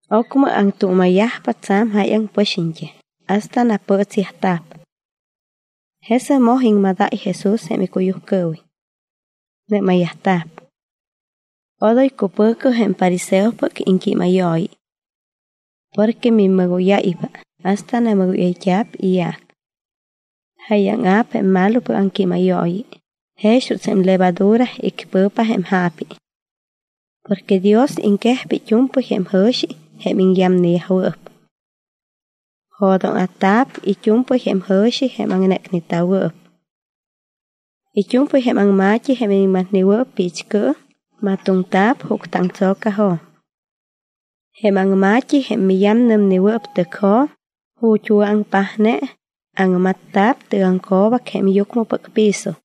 Ocmɨ aŋtuuma̱yajpa tsa̱m jáyaŋ pɨxiñt́am hasta napɨɨtsyajta̱p. Jesɨc moj iŋmadáy Jesús jém icuyujcɨɨwiñ. Nɨ́mayyajta̱p: —Cuidado. Odoy cupɨ̱cɨ jém fariseopɨc iŋquímayooyi. Porque mimɨgóyáypa hasta namɨgóyayt́a̱p iyaac. Jáyaŋa̱p jém malopɨc aŋquímayooyi jex juuts jém levadura icpɨ̱pa jém jaapi. Porque Dios iŋquejpa it́u̱mpɨy jém jɨ̱xi jém iŋyamneyajwɨɨp. Jo̱dóŋa̱ta̱p it́u̱mpɨy jém jɨ̱xi jém aŋnécneta̱wɨɨp. It́u̱mpɨy jém aŋma̱t́i jém iniŋmatnewɨɨp piichcɨɨm, matoŋta̱p juctɨaŋtso̱cajo̱m. Jém aŋma̱t́i jém miyamnɨmnewɨɨp tɨcjo̱m, ju̱t́ wɨ̱aŋpajne, aŋmatta̱p tɨgaŋco̱bac jém yucmɨpɨc piso.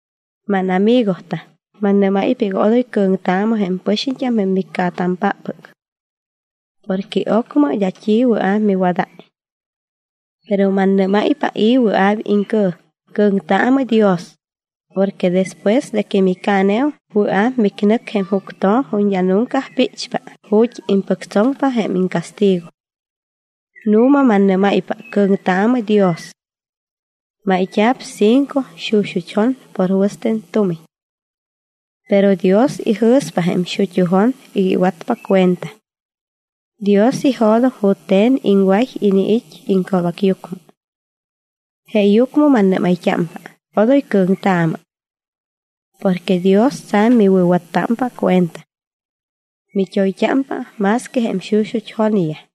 ’Mánamigotam, mannɨ́máypa iga odoy cɨ̱ŋtaamɨ jém pɨxiñt́am jém miccaatampáppɨc. Porque ocmɨ d́a t́i wɨa̱p miwadáy. Pero mannɨ́máypa i̱ wɨa̱p iŋcɨ̱ŋ, cɨ̱ŋtaamɨ Dios porque despues de que micaaneum, wɨa̱p micnɨc jém juctjo̱m ju̱t́ d́a nunca píchpa, ju̱t́ impɨctsoŋpa iŋcastigo. Nu̱ma mannɨ́máypa, cɨ̱ŋtaamɨ Dios. ’Máyt́a̱p cinco xuxut́ jon por wɨste̱n tumiñ. Pero Dios ijɨ̱spa jém xut́u jon iga iwatpa cuenta. Dios ijo̱doŋ jute̱n iŋway iniit́ iŋco̱bacyucmɨ. Jeeyucmɨ mannɨ́mayt́ámpa: Odoy cɨ̱ŋtaamɨ. Porque Dios tsa̱m miwɨ̱wattámpa cuenta. Mit́oyt́ámpa más que jém xuxut́ jonyaj.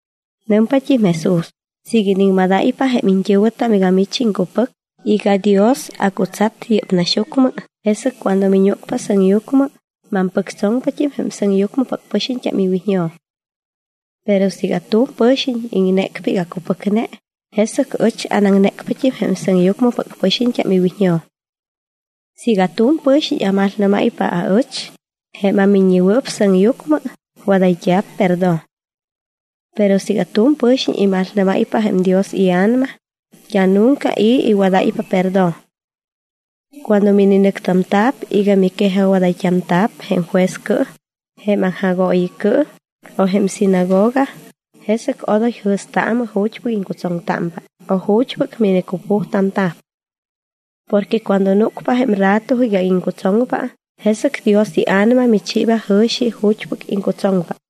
Nɨmpat́im Jesús: —Siiga iniŋmadáypa jém iñt́ɨ̱wɨtam iga mich iŋcupɨc iga Dios acutsat yɨ́p naxyucmɨ, jesɨc cuando miñúcpa sɨŋyucmɨ, mampɨctsoŋpat́im jém sɨŋyucmɨpɨc pɨxiñt́am iwiñjo̱m. Pero siiga tu̱m pɨ̱xiñ iŋnécpa iga acupɨcne, jesɨc ɨch anaŋnécpat́im jém sɨŋyucmɨpɨc pɨxiñt́am iwiñjo̱m. ’Siiga tu̱m pɨ̱xiñ amalnɨ́máypa aɨch, jém aMiññewɨɨp Sɨŋyucmɨ, wadayt́a̱p perdón. Pero siiga tu̱m pɨ̱xiñ imalnɨ́máypa jém Dios iA̱nama, d́a nunca i̱ iwadáypa perdón. ’Cuando mininɨctamta̱p iga miquejajwadayt́amta̱p jém juezcɨɨm, jém aŋjagooyicɨɨm, o jém sinagoga, jesɨc odoy jɨ̱staamɨ ju̱t́pɨc iŋcutsoŋtámpa o ju̱t́pɨc minicupujtamta̱p. Porque cuando núcpa jém rato iga iŋcutsoŋpa, jesɨc Dios iA̱nama michiiba jɨ̱xi ju̱t́pɨc iŋcutsoŋpa.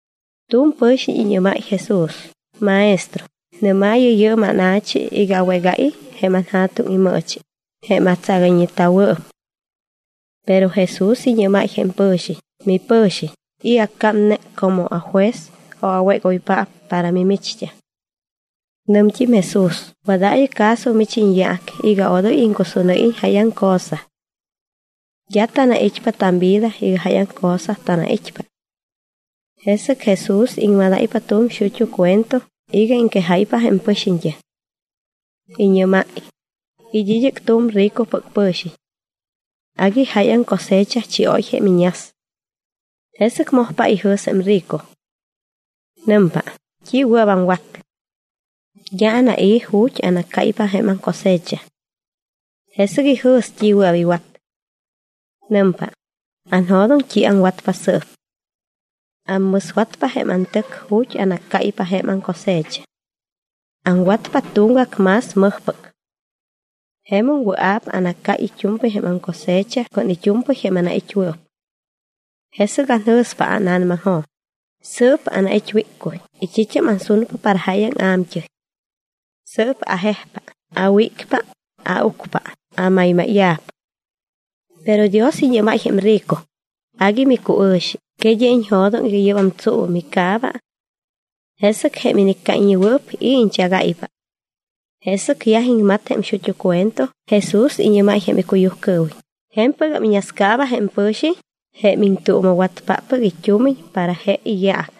Tu̱m pɨ̱xiñ iñɨ́máy Jesús: —Maestro, nɨ́maayɨ jém ána̱chi iga awégáyiñ jém anja̱tuŋ imɨɨchi jém atsagayñeta̱wɨɨp. Pero Jesús iñɨ́máy jém pɨ̱xiñ: —Mipɨ̱xiñ, ¿i̱ accámne como ajuez o awégoypaap para mimicht́am? Nɨmt́im Jesús: —Wadaayɨ caso mich iñyaac iga odoy iŋcusúnɨ́yiñ jáyaŋ cosa. D́a tanait́pa tamvida iga jáyaŋ cosa tanait́pa. Jesɨc Jesús iŋmadáypa tu̱m xut́u cuento iga iŋquejáypa jém pɨxiñt́am. Iñɨ́máy: —It́ id́ɨc tu̱m ricopɨc pɨ̱xiñ. Agui jáyaŋ cosecha chióy jém iñas. Jesɨc mojpa ijɨ̱s jém rico. Nɨmpa: “¿T́i wɨa̱p aŋwat? D́a anai̱ ju̱t́ anaccáypa jém aŋcosecha.” Jesɨc ijɨ̱s t́i wɨa̱p iwat. Nɨmpa: “Anjo̱doŋ t́i aŋwatpa sɨɨp. Ammɨswatpa jém antɨc ju̱t́ anaccáypa jém aŋcosecha. Aŋwatpa tuŋgac más mɨjpɨc. Jemum wɨa̱p anaccáy it́u̱mpɨy jém aŋcosecha con it́u̱mpɨy jém anait́wɨɨp. Jesɨc anjɨ̱spa ána̱namaŋjo̱m: Sɨɨp anait́ wíccuy y t́it́am ansunpa para jáyaŋ a̱mt́ɨy. Sɨɨp ajejpa, awícpa, aucpa, amaymáya̱p.” Pero Dios iñɨ́máy jém rico: “Agui micuɨ̱xi, ¿que d́a iñjo̱doŋ iga yɨ́bam tsuu micaaba? ¿Jesɨc jém iniccáyñewɨɨp, i̱ iñchagáypa?” Jesɨc yaj iŋmat jém xut́u cuento, Jesús iñɨ́máy jém icuyujcɨɨwiñ: —Je̱mpɨgam iñascaaba jém pɨ̱xiñ jém iŋtuuma̱watpáppɨc it́umiñ para je iyaac.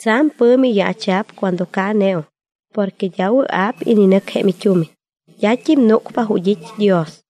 Tsa̱m pɨ̱mi yaacha̱p cuando caaneum porque d́a wɨa̱p ininɨc jém it́umiñ, d́at́im núcpa ju̱t́ it́ Dios.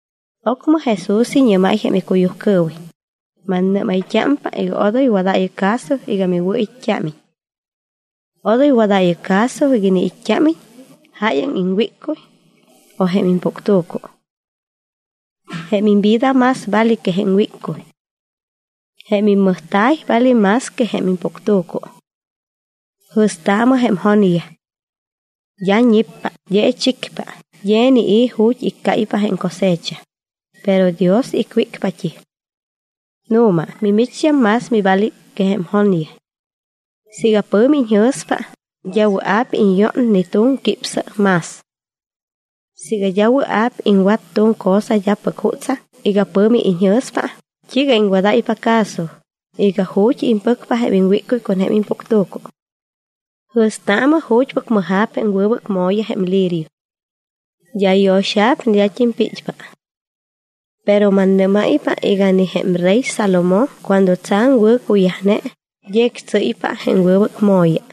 Ocmɨ Jesús iñɨ́máy icuyujcɨɨwiñ: —Mannɨ́mayt́ámpa iga odoy wadaayɨ caso iga miwɨ̱it́t́ámiñ. Odoy wadaayɨ caso iga iniit́t́ámiñ jáyaŋ iŋwíccuy o impuctu̱cu. Jém imvida más vale que jém iŋwíccuy. Jém immɨjta̱y vale más que jém impuctu̱cu. Jɨ̱staamɨ jém jonyaj. D́a ñippa, d́a ichicpa, d́a inii̱ ju̱t́ iccáypa jém cosecha, pero Dios icwícpat́im. Nu̱ma, mimicht́am más mivale que jém jonyaj. Siiga pɨ̱mi iñjɨ̱spa, d́a wɨa̱p iñyón ni tu̱m quípsɨ más. Siiga d́a wɨa̱p iŋwat tu̱m cosa d́apɨc jutsaŋ iga pɨ̱mi iñjɨ̱spa, ¿t́iiga iŋwadáypa caso iga ju̱t́ impɨcpa jém iŋwíccuy con jém impuctu̱cu? ’Jɨ̱staamɨ ju̱t́pɨc mɨja̱p jém wɨbɨc mo̱ya jém lirio. D́a yo̱xa̱p ni d́a pit́pa. Pero mannɨ́máypa ni jém rey Salomón cuando tsa̱m wɨ̱cuyajne, d́a ictsɨ́ypa jém wɨbɨc mo̱ya.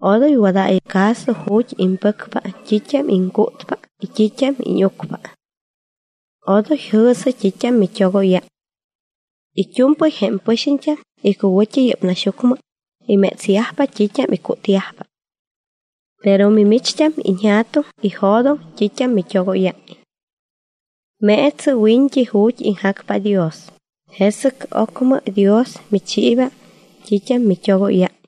Odoy wadaayɨ caso ju̱t́ impɨcpa t́it́am iŋcútpa y t́it́am íñucpa. Odoy jɨ̱sɨ t́it́am mit́ogóyáy. It́u̱mpɨy jém pɨxiñt́am icuwɨ̱t́i yɨ́p naxyucmɨ imétsyajpa t́it́am icútyajpa. Pero mimicht́am iñJa̱tuŋ ijo̱doŋ t́it́am mit́ogóyáy. Meetsɨ wiñt́i ju̱t́ iŋjacpa Dios, jesɨc ocmɨ Dios michiiba t́it́am mit́ogóyáy.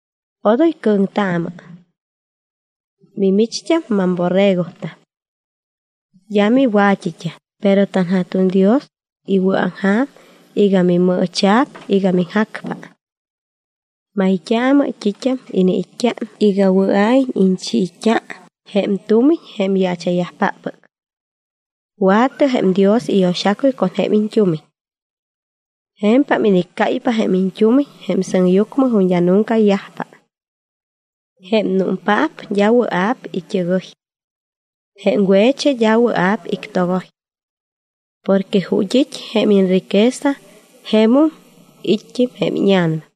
’Odoy cɨ̱ŋtaamɨ. Mimicht́am mamborregotam. D́a miwa̱t́it́am, pero tanJa̱tuŋ Dios iwɨ̱aŋja̱m iga mimɨɨcha̱p iga miŋjacpa. Mayt́aamɨ t́it́am iniit́t́a iga wɨa̱iñ iñchiit́a jém tumiñ jém yaacha̱yajpáppɨc. Wa̱tɨ jém Dios iyo̱xacuy con jém iñt́umiñ. Je̱mpam iniccáypa jém iñt́umiñ sɨŋyucmɨ ju̱t́ d́a nunca yajpa. Jém númpaap d́a wɨa̱p it́ɨgɨy. Jém we̱chi d́a wɨa̱p ictogoy. Porque ju̱t́ it́ jém iñriqueza, jemum it́t́im jém íña̱nama.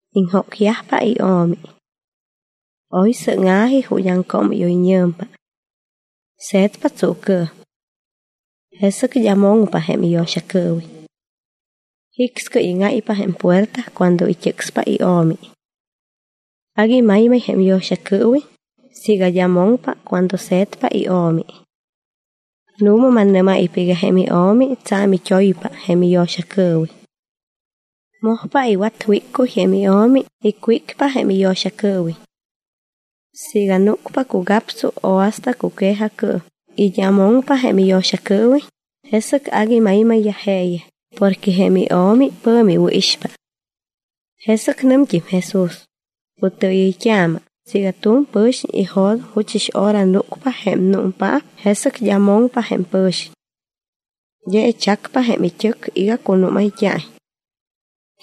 Iŋjócyajpa io̱mi. Oy sɨ́ŋa̱ji ju̱t́ aŋcoomɨ́yoyñɨ̱mpa. Se̱tpa tsuucɨɨm. Jesɨc d́a moŋpa jém iyo̱xacɨɨwiñ. Jicscɨy íŋáypa jém puerta cuando it́ɨcspa jém io̱mi. Agui maymay jém yo̱xacɨɨwiñ siiga d́a moŋpa cuando se̱tpa jém io̱mi. Nu̱ma mannɨ́máypa iga jém io̱mi tsa̱m it́oypa jém iyo̱xacɨɨwiñ. Mojpa iwat wíccuy jém io̱mi, icwícpa jém iyo̱xacɨɨwiñ. Siiga núcpa cugaptsu o hasta cuque̱jacɨɨm y d́a moŋpa jém iyo̱xacɨɨwiñ, jesɨc agui maymayyaj jeeyaj porque jém io̱mi pɨ̱mi iwɨ̱ixpa. Jesɨc nɨmt́im Jesús: —Cutɨɨyɨyt́aamɨ, siiga tu̱m pɨ̱xiñ ijo̱doŋ juchɨs hora núcpa jém númpaap, jesɨc d́a moŋpa jém pɨ̱xiñ. D́a ichacpa jém it́ɨc iga cunúmayt́a̱iñ.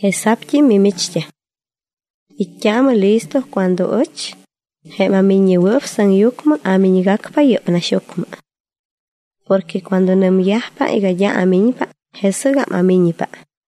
Jesa̱pt́im mimicht́am. It́t́aamɨ listo cuando ɨch, jém aMiññewɨɨp Sɨŋyucmɨ, amiñgacpa yɨ́p naxyucmɨ. Porque cuando nɨmyajpa iga d́a amiñpa, jesɨgam amiñpa.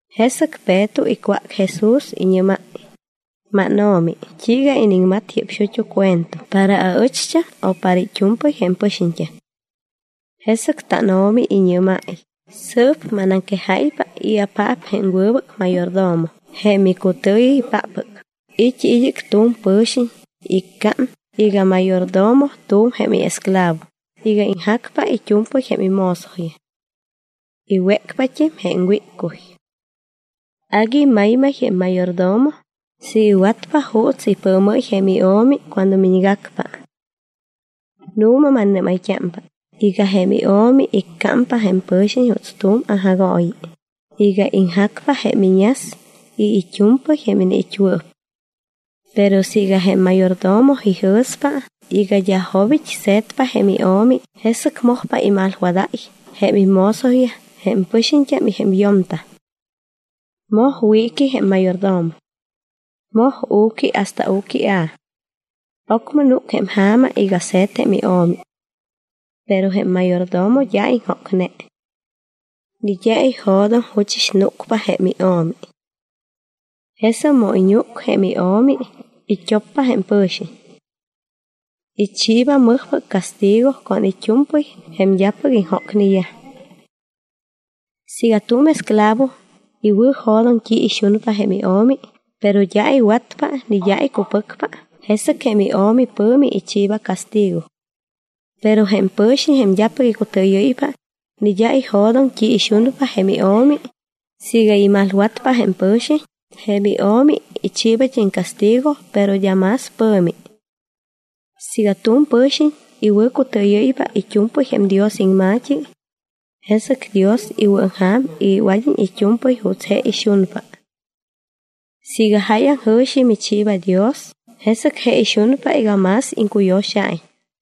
Jesɨc Peto icwác Jesús. Iñɨ́máy: —MánO̱mi, ¿t́iiga iniŋmat yɨ́p xut́u cuento, para aɨcht́am o para it́u̱mpɨy jém pɨxiñt́am? Jesɨc tánO̱mi iñɨ́máy: —Sɨɨp manaŋquejáypa i̱apaap jém wɨbɨc mayordomo jém icutɨɨyɨypáppɨc. It́ id́ɨc tu̱m pɨ̱xiñ iccám iga mayordomo tu̱m jém iesclavo iga iŋjacpa it́u̱mpɨy jém imozoyaj. Iwécpat́im jém wíccuy. Agui maymay jém mayordomo siiga iwatpa juuts ipɨɨmɨ́y jém io̱mi cuando miñgacpa. Nu̱ma mannɨ́mayt́ámpa iga jém io̱mi iccámpa jém pɨ̱xiñ juuts tu̱m aŋjagooyi iga iŋjacpa jém iñas y it́u̱mpɨy jém iniit́wɨɨp. Pero siiga jém mayordomo ijɨ̱spa iga d́a jobit́ se̱tpa jém io̱mi, jesɨc mojpa imalwadáy jém imozoyaj jém pɨxiñt́am y jém yo̱mtam. Moj wiiqui jém mayordomo. Moj u̱qui hasta u̱quia̱p. Ocmɨ núc jém ja̱ma iga se̱t jém io̱mi. Pero jém mayordomo d́a iŋjócne. Ni d́a ijo̱doŋ juchɨs núcpa jém io̱mi. Jesɨc mu iñúc jém io̱mi, it́oppa jém pɨ̱xiñ. Ichiiba mɨjpɨc castigo con it́u̱mpɨy jém d́apɨc iŋjócneyaj. ’Siiga tu̱m esclavo iwɨ̱jo̱doŋ t́i ixunpa jém io̱mi pero d́a iwatpa ni d́a icupɨcpa, jesɨc jém io̱mi pɨ̱mi ichiiba castigo. Pero jém pɨ̱xiñ jém d́apɨc icutɨɨyɨ́ypa ni d́a ijo̱doŋ t́i ixunpa jém io̱mi, siiga imalwatpa jém pɨ̱xiñ, jém io̱mi ichiibat́im castigo, pero d́a más pɨ̱mi. Siiga tu̱m pɨ̱xiñ iwɨ̱cutɨɨyɨ́ypa it́u̱mpɨy jém Dios iŋma̱t́i, jesɨc Dios iwɨ̱aŋja̱m iga iwad́iñ it́u̱mpɨy juuts je ixunpa. Siiga jáyaŋ jɨ̱xi michiiba Dios, jesɨc je ixunpa iga más iŋcuyo̱xa̱iñ.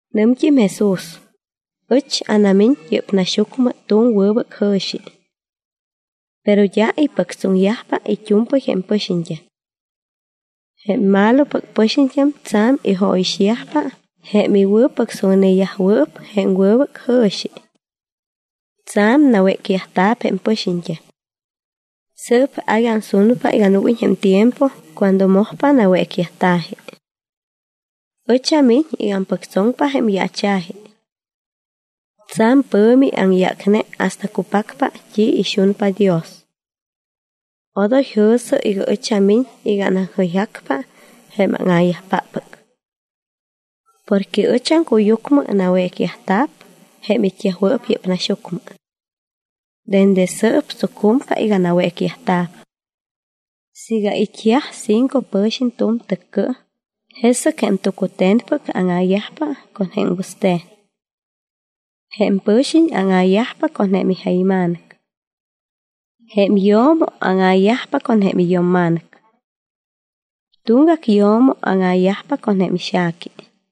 Nɨmt́im Jesús: —Ɨch anamiñ yɨ́p naxyucmɨ tu̱m wɨbɨc jɨ̱xi. Pero d́a ipɨctsoŋyajpa it́u̱mpɨy jém pɨxiñt́am. Jém malopɨc pɨxiñt́am tsa̱m ijóyixyajpa jém iwɨ̱pɨctsoŋneyajwɨɨp jém wɨbɨc jɨ̱xi. Tsa̱m nawécyajta̱p jém pɨxiñt́am. Sɨɨp agui ansunpa iga núguiñ jém tiempo cuando mojpa nawécyajta̱ji. Ɨch amiñ iga ampɨctsoŋpa jém yaacha̱ji. Tsa̱m pɨ̱mi aŋyácne hasta que cupacpa t́i ixunpa Dios. Odoy jɨ̱sɨ iga ɨch amiñ iga anaŋjɨyjacpa jém áŋa̱yajpáppɨc. Porque ɨch aŋcuyucmɨ nawécyajta̱p jém it́yajwɨɨp yɨ́p naxyucmɨ. Dende sɨɨp tsucumpa iga nawécyajta̱p. Siiga it́yaj cinco pɨ̱xiñ tu̱m tɨccɨɨm, jesɨc jém tucute̱npɨc áŋa̱yajpa con wɨste̱n. Jém pɨ̱xiñ áŋa̱yajpa con ija̱yma̱nɨc. Jém yo̱mo áŋa̱yajpa con iyo̱mma̱nɨc. Tuŋgac yo̱mo áŋa̱yajpa con ixa̱qui.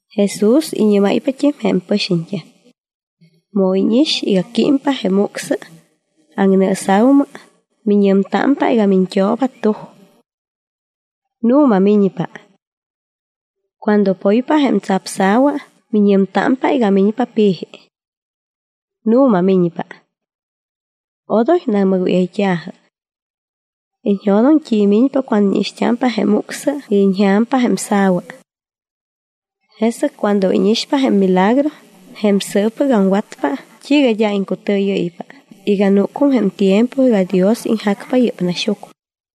Jesús iñɨ́máypat́im jém pɨxiñt́am: —Mu íñix iga químpa jém ucsɨ aŋnɨɨsa̱umɨ, miñɨmtámpa iga miñt́ooba tuj. Nu̱ma miñpa. Cuando poypa jém tsapsa̱wa, miñɨmtámpa iga miñpa pi̱ji. Nu̱ma miñpa. Odoy namɨgóyayt́a̱jɨ. Iñjo̱doŋ t́i miñpa cuando íñixt́ámpa jém ucsɨ y iñja̱mpa jém sa̱wa. Jesɨc cuando íñixpa jém milagro jém sɨɨppɨc aŋwatpa, ¿t́iiga d́a iŋcutɨɨyɨ́ypa iga núcum jém tiempo iga Dios iŋjacpa yɨ́p naxyucmɨ?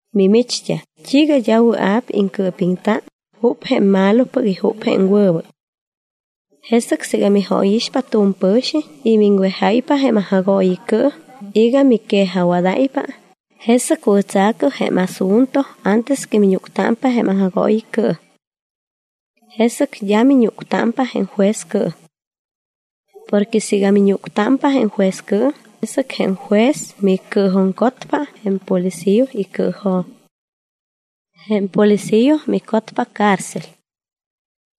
’¿Mimicht́am, t́iiga d́a wɨa̱p iŋcɨɨpiŋta jup jém malopɨc y jup jém wɨbɨc? Jesɨc siiga mijóyixpa tu̱m pɨ̱xiñ y miŋwejáypa jém aŋjagooyicɨɨm iga miquejajwadáypa, jesɨc wɨ̱tsa̱cɨ jém asunto antes que miñúctámpa jém aŋjagooyicɨɨm. Jesɨc d́a miñúctámpa jém juezcɨɨm. Porque siiga miñúctámpa jém juezcɨɨm, jesɨc jém juez micɨɨjuŋcotpa jém policía icɨɨjo̱m. Jém policía micotpa cárcel.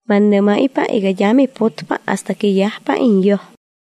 Mannɨ́máypa iga d́a miputpa hasta que yajpa iñyoj.